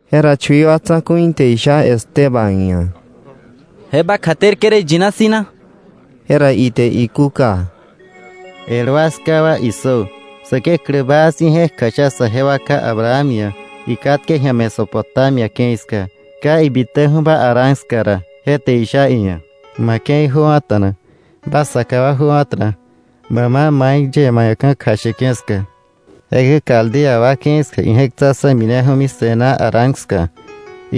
Jera chui wa tsa̱ku̱i te isha Esteban ia̱: —¿Je ba kjaterke̱ rä iyina si̱ na? Jera ite ikúka: “El wa, 'ská wa, issö. Säkeklä baa si̱ je̱k kjasha saje wa ká Abraham ia̱ ikatke ji̱a Mesopotamia ke̱i ska, ka ibitäju̱ba Harán ska ra. Je te isha iia̱: ‘Ma ke̱i jöwa̱ta̱na. Ba saka wa jöwa̱ta̱na, bä ma mai yie ma ia̱ ka̱ kjasheke̱ ska.’ Jekäi Caldea wa ke̱i ska ije̱k tsa̱ksa̱ mineju̱mi se̱ná Harán ska.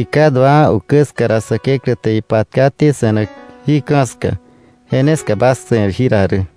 Iká duawa̱ ukä ska ra Säkeklä te ipatkaté se̱nak jí ka̱ ska. Je ne ska bas se̱r jira rä.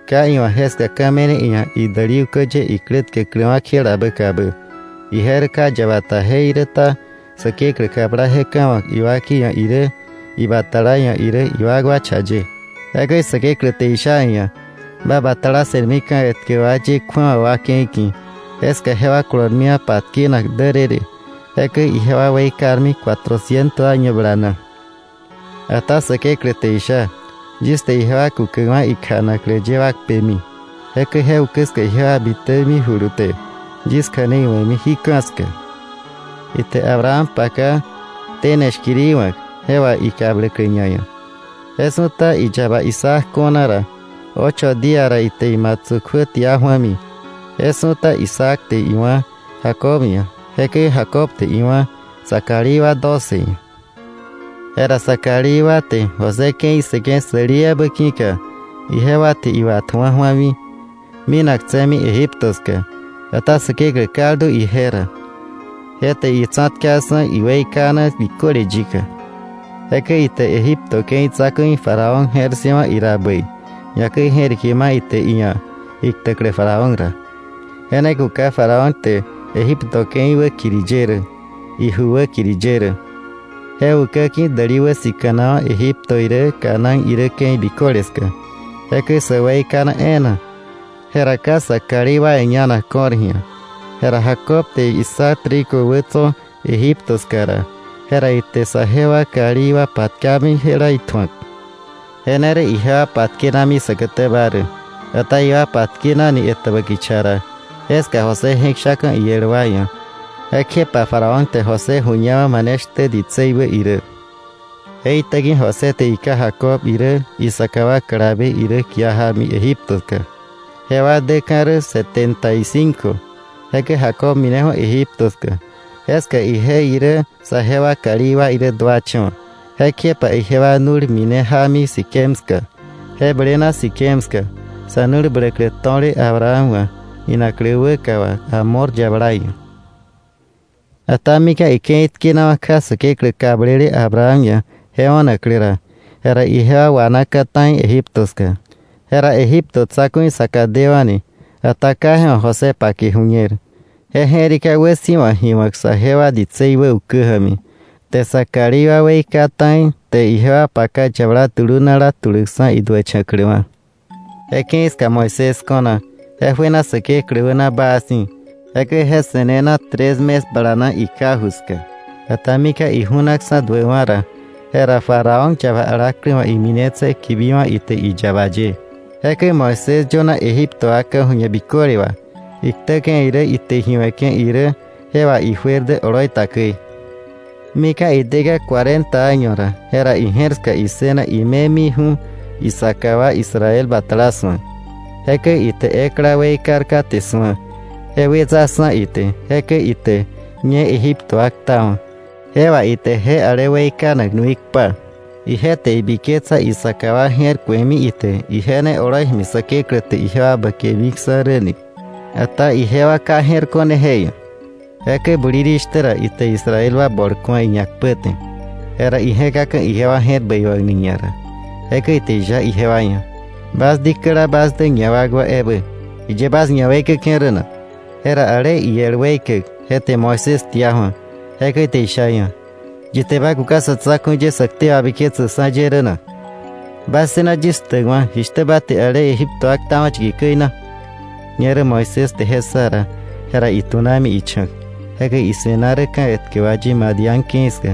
Ka iwa̱ jeska ka̱ me̱ne iia̱ idäli ukä ye iklä tkäkläwa̱ kjelabä kabä. Ije rä ka yaba ta jeiräta Säkeklä kabla je ka̱ ma̱k iwakei ia̱ irä, ibatala ia̱ irä iwakwa cha ye. Jekäi Säkeklä te isha iia̱: ‘Ba batala se̱rmi ka̱ etkä wa ye kju̱awa wa ke̱i ki̱. Jeska jewa kolormiwa̱ patkenak därërë. Jekäi ijewa weikarmi cuatrociento año bala na.’ Ata Säkeklä te isha: ‘Yis te ijewa kukäkwa̱ ikja̱naklä ye wa kpemi. Jekäi je ukä ska ijewa bitämijulu te yis kja̱nei we̱mi jí ka̱ ska.’ Ite Abraham paka tene shkiri wa̱k, je wà ikabläklä ñaia̱. Je su̱ta iyaba Isaac ko̱na ra, ocho día ra ite imatsu̱ kjuä tia ju̱ami. Je su̱ta Isaac te iwá̱ Jacob ia̱. Jekäi Jacob te iwá̱ sa kalí wa doce ia̱. “Jera sa kalí wa te José ke̱i ssëke̱ säli ebä ki̱ka ijewa te iwatju̱a ju̱ami, minaktse̱mi Egipto ska. Ata Säkeklä kaldu ije ra. Je te itsa̱tkaksa̱ iweikana biköle yika. Jekäi ite Egipto ke̱i tsa̱ku̱i Faraón je̱r ssëwa̱ ira bäi, ñakäi je̱rike ma ite iia̱ iktäklä Faraón ra. Je ne kuka Faraón te Egipto ke̱i wäkiri ye rä, iju wäkiri ye rä. “Je ukä ki̱ däli wäsika̱nawa̱ Egipto irä, Canaán irä ke̱i biköle ska, jekäi sä weikana e̱e̱na. Jera ka sa kalí wa ia̱ ñanak ko̱r ji̱a. Jera Jacob te issa trigo wä tso̱ Egipto ska ra, jera ite saje wa kalí wa patkami jela itju̱ak, je ne rä ijewa patkenami säkätäba rä. Ata ijewa patkenani etäbä kicha ra, jeska José je̱k shaka̱ iel wa ia̱. Jekjepa Faraón te José ju̱ñawa̱ mane shtä ditsei wä irä. Je itäki̱ José te iká Jacob irä isaka wa kalabe irä kia jámi Egiptoka. Jewa däka̱ rä setenta y cinco. Jekäi Jacob mineju̱ Egipto ska. Jeska ije irä saje wa kalí wa irä duacha̱wa̱. Jekjepa ijewa nu̱l mine jámi Siquem ska, je blena Siquem ska sa̱ nu̱l bläklä to̱le Abraham wa̱ inaklä wäka wà Hamor yabala ia̱. “Ata mika̱ ike̱i tkenawa̱ kja Säkeklä kablele Abraham ia̱ je o̱naklä ra, jera ijewa wanaka̱ ta̱i Egipto ska, jera Egipto tsa̱ku̱i saka dewa̱ni. Ata ka je wa̱ José pake ju̱ñer. Je je̱rika wäsi̱wa ji wa̱k saje wa ditsei wä ukä ja̱mi, te sa kalí wa weika ta̱i te ijewa paka yabala dulunala tuläkksa̱ iduächa̱kläwa̱. Je ke̱i ska Moisés ko̱na. Je juena Säkeklä wäna baa si̱. Jekäi je se̱nena tres mes balana ika ju ska. Ata mika̱ iju̱naksa̱ duäkwa̱ ra, jera Faraón yaba alaklä wa̱ iminetse̱ kibiwa̱ ite iyaba ye. Jekäi Moisés yöna Egipto wa ka̱ju̱ñe biköle wà. Iktäke̱ irä ite ji we̱ke̱ irä je wà ijuer dä oloi ta käi. “Mika̱ ideka̱ cuarenta año ra, jera ije̱r ska issëna ime miju̱ isaka wa Israel batala su̱ak. Jekäi ite ekla weikar kate su̱a, je wetsaksa̱ ite, jekäi ite ñe Egipto wa ktawa̱. Je wà ite je ale weikanak nui kpa. Ije te ibiketsa isaka wa je̱r ku̱emi ite ije ne oloi ja̱mi Säkeklä te ijewa bäkemiksa̱ rä ni. Ata ijewa ka je̱r ko̱ne je ia̱. Jekäi bulirishtä ra ite Israel wa bol ku̱a iñakpäte. Jera ije̱kaka̱ ijewa je̱r bäiwa̱kni ñara, jekäi ite isha ijewa ia̱: ‘Bas dikäla bas dä ñawakwa ebä, ¿jiye bas ñaweikäke̱ rä na?’ Jera ale iel weikäk je te Moisés tia ju̱a. Jekäi ite isha iia̱: ‘¿Yi te ba kuka sa̱ tsa̱ku̱i ye sä ktei wabiketsäkksa̱ ye rä na? ¿Ba ssëna yis ktäkwa̱, jishtä ba te je Egipto wa ktawa̱ yiki käi na?’ Ñerä Moisés te je ssa ra, je ra itunami icha̱k. Jekäi ise̱na rä ka̱ etkä wa ye Madián ke̱i ska.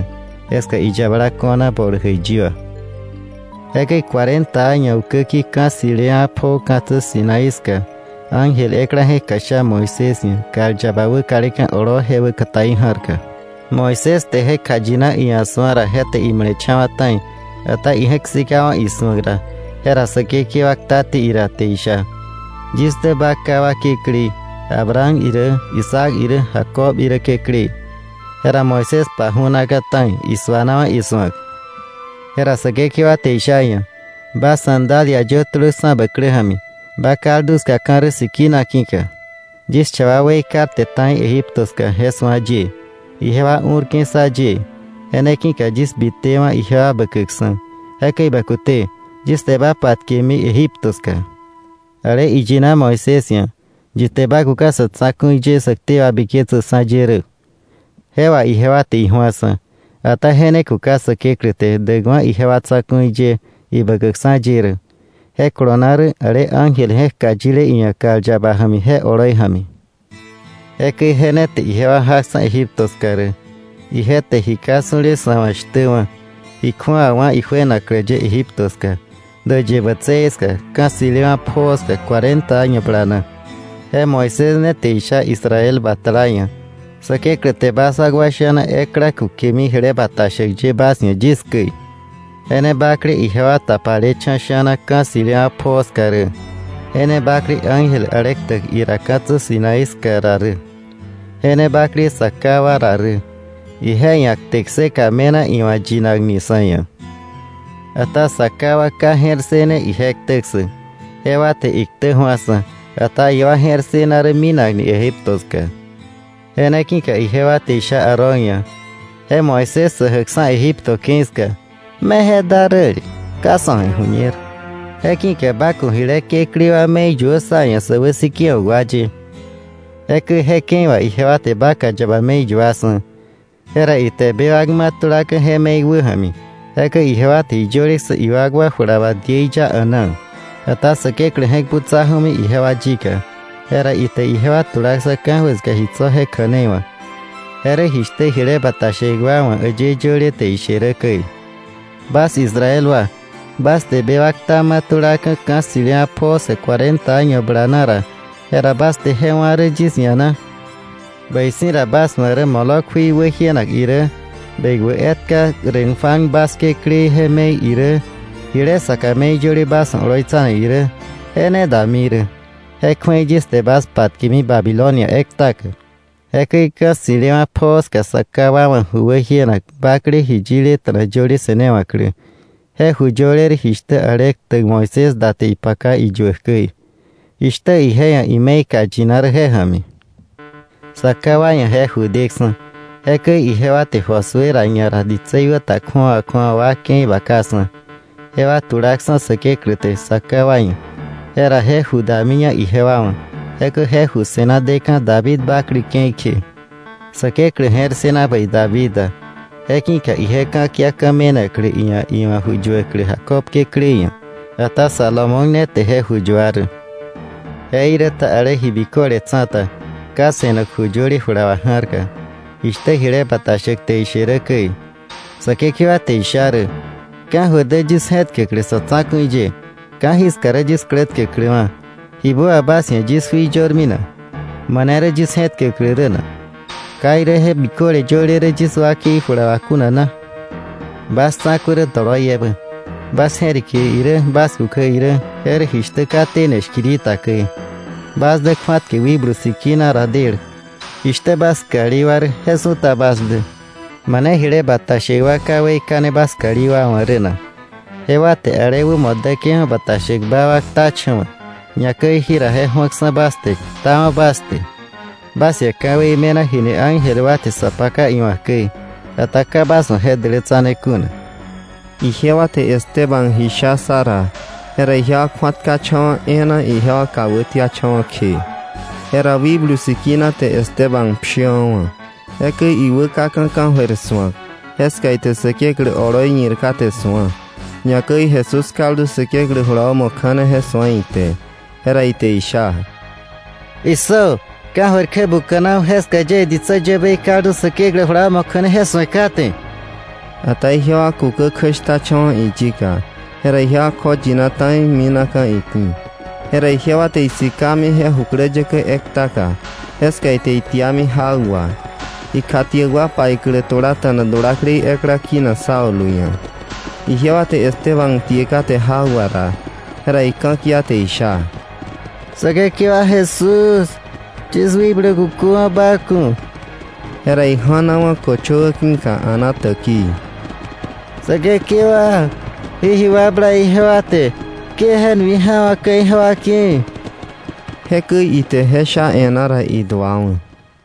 Jeska iyabala ko̱na bol jäiyi wa. “Jekäi cuarenta año ukäki̱ ka̱ ssi̱lewa̱ pjoo ka̱tsä Sinaí ska ángel ekla je̱k kjasha Moisés ia̱ kal yaba wäkaleka̱ oloo je wäkataí ja̱rka. Moisés te je kjayina iia̱ su̱a ra je te imale̱cha̱wa̱ ta̱i. Ata ije̱k sikawa̱ isu̱ak ra, jera Säkekewa ktaté ira te isha: “Yis dä ba ká wa Kekläí, Abraham irä Isaac irä Jacob irä Kekläí.” Jera Moisés paju̱naka̱ ta̱i, suanawa̱ isu̱ak. Jera Säkekewa te isha iia̱: “Ba sandalia yö tulöksa̱ bä klä ja̱mi, ba kaldu ska ka̱ rä sikina ki̱ka. Yis cha wa weikarte ta̱i Egipto ska je su̱a yie. Ijewa u̱rke̱ ssa yie. Je ne ki̱ka yis bitewa̱ ijewa bäkäkksa̱. Jekäi bä kute; yis te ba patkeke̱mi Egipto ska.” Ale iyina Moisés ia̱: “¿Yi te ba kuka sa̱ tsa̱ku̱i ye, sä ktei wabiketsäkksa̱ ye rä?”, je wà ijewa te iju̱aksa̱. Ata je ne kuka Säkeklä te däkwa̱ ijewa tsa̱ku̱i ye ibäkäkksa̱ ye rä. Je kolona rä ale ángel je̱k kjayile iia̱ kal yaba ja̱mi je oloi ja̱mi. Jekäi je ne te ijewa jaksa̱ Egipto ska rä. Ije te ji ka su̱le sa̱ wa̱ shtä wá̱, ji kju̱awa wá̱ ijuenaklä ye Egipto ska, Däyë Bätsëë ska, ka̱ ssi̱lewa̱ pjoo ska, cuarenta año bala na. Je Moisés ne te isha Israel batala ia̱: ‘Säkeklä te bas wakwa sha̱na ekla kukemi jile bata shäk ye bas ia̱ yis käi.” Je ne bakle ijewa tapalecha̱ sha̱na ka̱ ssi̱lewa̱ pjoo ska rä, je ne bakle ángel ale ktäk ira ka̱tsä Sinaí ska ra rä, je ne bakle sa ká wa ra rä. Ije ia̱ kte kseka me̱na iwa̱ yinakni sa̱ ia̱. “Ata sa ká wa ka je̱r ssëne ije ktä ssäk. Jewa te iktä ju̱aksa̱. Ata ijewa je̱r ssëna rä minakni Egipto ska. Je ne ki̱ka ijewa te isha Aarón ia̱: ‘Je Moisés sä jäkksa̱ Egipto ke̱i ska, me je da räle, ka sa̱ wa̱ iju̱ñer. Je ki̱ka ba ku̱ jile kekläí wa me̱i yuö sá ia̱ sä wäsikewa̱k wa ye.’ Jekäi je ke̱i wà ijewa te vaca yaba me̱i yuaksa̱. Jera ite bewak ma̱ tulaka̱ je me̱i wäja̱mi. Jekäi ijewa te ji yöleksa̱ iwakwa jula wà diei ya a̱naa. Ata Säkeklä je̱k butsa ju̱ami ijewa yika, jera ite ijewa tulaksa̱ ka̱jöir ska ji tso̱ je kja̱nei wa̱k. Je rä jishtä jile bata shäk wa wa̱ äyë yöle te ishe rä käi: “Bas Israel wa, bas te bewak kta ma̱ tulaka̱ ka̱ ssi̱lewa̱ pjoo ska cuarenta año bala na ra, ¿jera bas te je wá̱ rä yis ia̱ na? Bäi si̱ ra, bas wa̱ rä Moloc jui wäjienak irä, bekwä etka Renfán bas kekläí je me̱i irä, jile saka me̱i yöle bas wa̱ oloitsanak irä, je ne dami rä. Je kju̱ei yis te bas patkemi Babilonia ektaka.” “Jekäi ka̱ ssi̱lewa̱ pjoo ska sa ká wa wa̱ ju wäjienak bakle ji yileta̱na yöle se̱newa̱klä. Je ju yöle rä jishtä ale ktäk Moisés da te ipaka iyuäk käi, jishtä ije ia̱ ime̱i kjayina rä je ja̱mi. Sa ká wa ia̱ je ju deksa̱. Jekäi ijewa te Josué ra ñara ditsei wä ta kju̱awa kju̱awa wa ke̱i bakaksa̱, jewa tulaksa̱ Säkeklä te sa ká wa ia̱, jera je ju damiña ijewa wa̱, jekäi je ju se̱na deka̱ David bakle ke̱i kje. Säkeklä je̱r ssëna bäi David da. Je ki̱ka ije ka̱kia ka̱ me̱naklä iia̱ iwa̱ ju yuäklä Jacob Kekläí ia̱. Ata Salomón ne te je ju yua rä. Jeiräta ale Ji Biköle Tsa̱ta ka se̱nak ju yöle jula wà ja̱rka, jishtä jile bata shäk te ishe rä käi: “Säkekewa te isha rä: Ka̱jöir dä yis je̱tkäklä sa̱ tsa̱ku̱i ye. Ka̱jiska rä yis klä tkäkläwa̱. Jibä wà bas ia̱ yis jui yörmi na? ¿Mane rä yis je̱räklä rä na? ¿Ka irä je biköle yöle rä yis wakei jula wà kuna na?” “Bas tsa̱ku̱ rä doloiebä. Bas je̱rike irä, bas kukä irä, je rä jishtä ka tene shkiri ta käi. Bas dä kju̱atkäk Wikblu Sikina ra del. Jishtä bas kalí wa rä je su̱ta bas dä. ¿Mane jile bata shäk wa ka weikane bas kalí wa wa̱ rä na? Jewa te ale wämo däke̱ju̱ bata shäkba wa ktacha̱wa̱. Ñakäi jira je ju̱aksa̱ bas te, ktawa̱ bas te. Bas ia̱ ka̱wei me̱na jini ángel wa te sa paka iwa̱k käi, ata ka bas wa̱ je dälätsane kuna.” Ijewa te Esteban ji sha ssa ra, jera ijewa kju̱atkacha̱wa̱ e̱e̱na ijewa kà wätiacha̱wa̱ kje. Jera Wikblu Sikina te Esteban pshiwa̱wa̱. Jekäi iwäkaka̱ ka̱jöir su̱ak, jeska ite Säkeklä oloi ñir kate su̱a. Ñakäi Jesús kaldu Säkeklä jula wämo kja̱ne je su̱a ite. Jera ite isha: —Issö, ka̱jöir kjä buka̱naju̱, jeska yie ditsä yäbei kaldu Säkeklä jula wämo kja̱ne je su̱e kate. Ata ijewa kukä kjäshtacha̱wa̱ iyika. Jera ijewa kjoyina ta̱i minaka̱ iki̱. Jera ijewa te isikami je jukläyäkä ektaka, jeska ite itiami jak wà. Ikjatiäk wa paiklä tulata̱na dulaklei ekla kinak Saulo ia̱. Ijewa te Esteban tie kate jak wà ra, jera ika̱kia te isha: “Säkekewa Jesús, yis wikblu kuköwa̱ ba ku̱.” Jera ija̱nawa̱ köchöwä ki̱ka a̱na täkii: “Säkekewa, jí ji wakbla ijewa te ke je nui ja̱wa̱kka̱ ijewa ki̱.” Jekäi ite je sha e̱ná ra, iduawa̱.